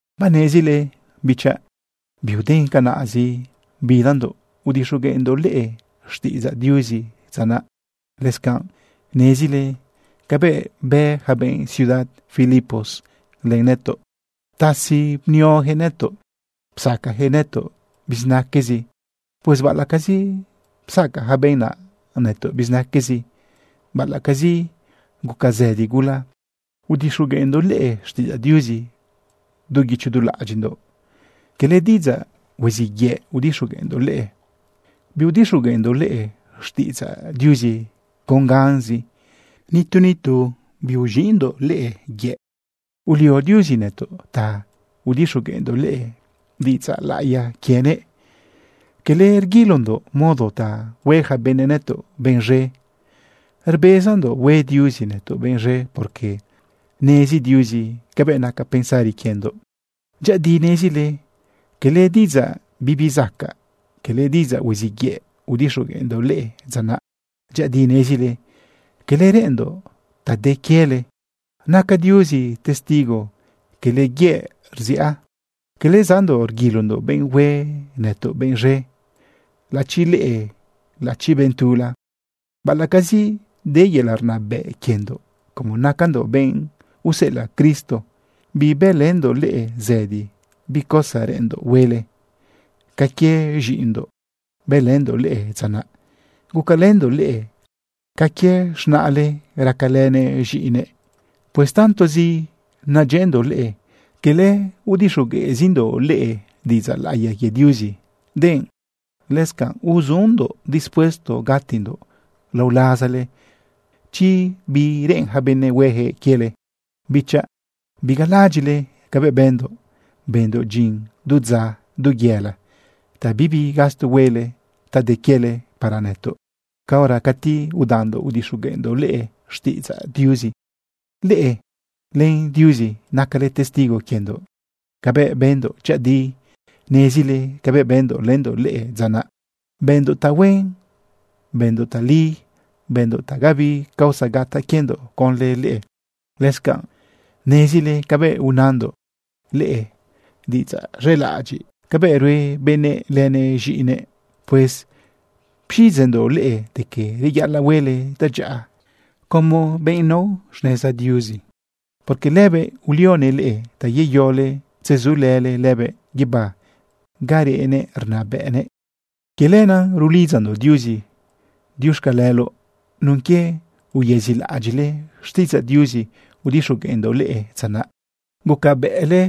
Banezile, bichaꞌ, biuden canaꞌzi bidandoꞌ udixogueꞌndoꞌ leꞌe xtiꞌidzaꞌ Diuzi dza naꞌ. Lëscanꞌ nezile cabëꞌ bë yaca benꞌ ciudad Filipos len nëtoꞌ. Ptasi bnioyaquëꞌ nëtoꞌ. Psacayaquëꞌ nëtoꞌ bizinaquezi. Pues baꞌalaꞌcazi psaca yaca benꞌ naꞌ nëtoꞌ bizinaquezi, baꞌalaꞌcazi guca zëdi gula, udixogueꞌndoꞌ leꞌe xtiꞌidzaꞌ Diuzi du guicho du laꞌadyiꞌndoꞌ. Cala diꞌidzaꞌ huiziꞌ yëꞌ udixogueꞌndoꞌ leꞌe. Biudixogueꞌndoꞌ leꞌe xtiꞌidzaꞌ Diuzi con ganzi. Nitu nitu biuz̃iꞌndoꞌ leꞌe yëꞌ. Ulio Diuzi nëtoꞌ ta udixogueꞌndoꞌ leꞌe diꞌidzaꞌ laꞌiya quienëꞌ. Cala rguilondoꞌ modo ta hue yaca benëꞌ nëtoꞌ benꞌ z̃e. Rbezandoꞌ hue Diuzi nëtoꞌ benꞌ z̃e, porque nezi Diuzi cabëꞌ naca pensari quiendoꞌ. Dyëꞌëdi nezile cala diꞌidzaꞌ bibizacaꞌ, cala diꞌidzaꞌ huiziꞌ yëꞌ, udixogueꞌndoꞌ leꞌe dza naꞌ. Dyëꞌëdi nezile quele reꞌenndoꞌ ta de quiele. Naca Diuzi testigo cala yëꞌ rziꞌa. Cala zaꞌndoꞌ rguilondoꞌ benꞌ hue nëtoꞌ benꞌ z̃e, laꞌachi leꞌe, laꞌachi benꞌ tula. Baꞌalaꞌcazi de yelaꞌ rnabëꞌ quiendoꞌ, como nacandoꞌ benꞌ useꞌelaꞌ Cristo, bibëlëndoꞌ leꞌe zëdi bi cosa reꞌenndoꞌ huele. Ca quie z̃iꞌindoꞌ bëlëndoꞌ leꞌe dza naꞌ. Gucalëndoꞌ leꞌe ca quie z̃naꞌle racalënëꞌ z̃iꞌinëꞌ. Pues tantozi nadyëꞌëndoꞌ leꞌe, cala udixogueꞌzindoꞌ leꞌe diꞌidzaꞌ laꞌiya quie Diuzi, denꞌ lëscanꞌ uzundoꞌ dispuesto gatindoꞌ lao lazale chi bi reꞌen yaca benëꞌ hueyaquëꞌ quiele. Bichaꞌ, bigalalaꞌadyiꞌle cabëꞌ bëndoꞌ, bëndoꞌ dyin du dza, du yëla, ta bibi gasto huele ta de quiele para nëtoꞌ caora cati udandoꞌ udixogueꞌndoꞌ leꞌe xtiꞌidzaꞌ Diuzi. Leꞌe len Diuzi, nacale testigo quiendoꞌ cabëꞌ bëndoꞌ. Dyëꞌëdi nezile cabëꞌ bëndoꞌ lëndoꞌ leꞌe dza naꞌ. Bëndoꞌ tahuen, bëndoꞌ tali, bëndoꞌ ta gabi causa gataꞌ quiendoꞌ conlë leꞌe. Lëscanꞌ nezile cabëꞌ unandoꞌ leꞌe diꞌidzaꞌ z̃elaꞌadyiꞌ cabëꞌ rue benëꞌ lënëꞌ z̃iꞌinëꞌ. Pues pxiꞌidzeꞌndoꞌ leꞌe de que reyaꞌalaꞌ huele tadyaꞌa como benꞌ nao xneza Diuzi, porque lëbëꞌ ulionëꞌ leꞌe ta yeyole tzezulële lëbëꞌ guibá ga reꞌnëꞌ rnabëꞌnëꞌ. Quie lenaꞌ rulidzandoꞌ Diuzi diuxcaleloꞌ nun quie uyëzilaꞌadyiꞌle xtiꞌidzaꞌ Diuzi udixogueꞌndoꞌ leꞌe dza naꞌ. Gucabëꞌle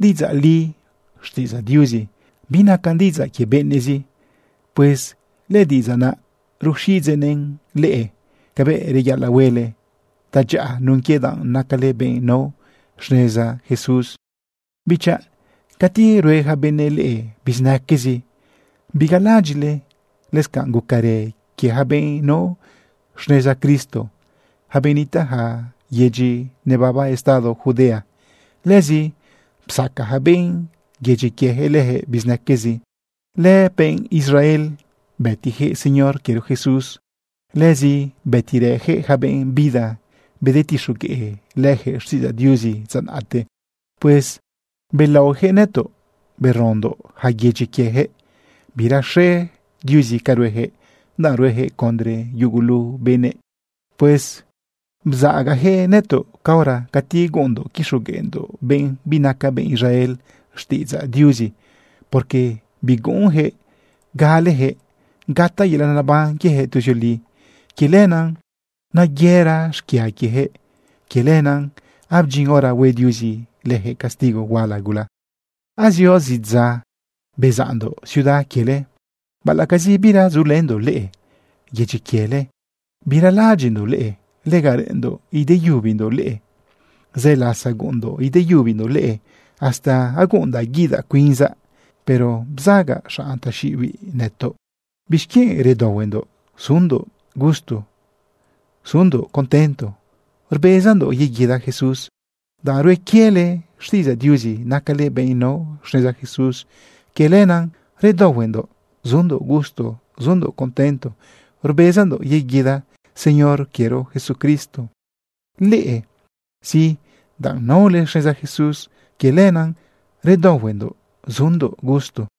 diꞌidzaꞌ li xtiꞌidzaꞌ Diuzi, binacan diꞌidzaꞌ quie benëꞌzi. Pues lëdiꞌidzaꞌ naꞌ ruxiꞌidzeꞌn leꞌe cabëꞌ reyaꞌalaꞌ huele tadyaꞌa nun quie danꞌ nacale benꞌ nao xneza Jesús. Bichaꞌ, cati rue yaca benëꞌ leꞌe bizinaquezi, bigalaꞌadyiꞌle lëscanꞌ gucarë quie yaca benꞌ nao xneza Cristo, yaca benꞌ nitaꞌ yaca yedyi nababa estado Judea. Lëzi psaca yaca benꞌ yedyi quiejëꞌ leyaquëꞌ bizinaquezi. Lëbenꞌ Israel bëtiyaquëꞌ Señor quiero Jesús. Lëzi bëtirëyaquëꞌ yaca benꞌ bida bedetixogueꞌ leyaquëꞌ xtiꞌidzaꞌ Diuzi dza naꞌte. Pues belaoyaquëꞌ nëtoꞌ berondoꞌ yaca yedyi quiejëꞌ. Biraxe Diuzi ca ruejëꞌ, danꞌ ruejëꞌ condre yugulu benëꞌ. Pues bzaꞌagayaquëꞌ nëtoꞌ caora cati guꞌunndoꞌ quixogueꞌndoꞌ benꞌ binaca benꞌ Israel xtiꞌidzaꞌ Diuzi, porque biguꞌunyaquëꞌ galeyaquëꞌ gataꞌ yelaꞌ neban quieyaquëꞌ tuzioli. Quie lenaꞌ nayëra xquia quieyaquëꞌ. Quie lenaꞌ abdyin hora hue Diuzi lëjëꞌ castigo huala gula. Azio zidza bezaꞌndoꞌ ciudad quiele. Baꞌalaꞌcazi bira zulëndoꞌ leꞌe yedyi quiele, biralalaꞌadyiꞌndoꞌ leꞌe. Lega reꞌenndoꞌ ideyubindoꞌ leꞌe. Zë lasa guꞌunndoꞌ ideyubindoꞌ leꞌe hasta aguꞌundaꞌ guidaꞌ cuinzaꞌ, pero bzaꞌaga xanꞌ taxiꞌibiꞌ nëtoꞌ. ¿Bixquienꞌ redaohuendoꞌ zundoꞌ gusto, zundoꞌ contento rbezandoꞌ yeguida Jesús? Danꞌ rue quiele xtiꞌidzaꞌ Diuzi nacale benꞌ nao xneza Jesús, quie lenaꞌ redaohuendoꞌ zundoꞌ gusto, zundoꞌ contento rbezandoꞌ yeguida Señor quiero Jesucristo. Leꞌe, sí, danꞌ naole xneza Jesús, quie lenaꞌ redaohuendoꞌ zundoꞌ gusto.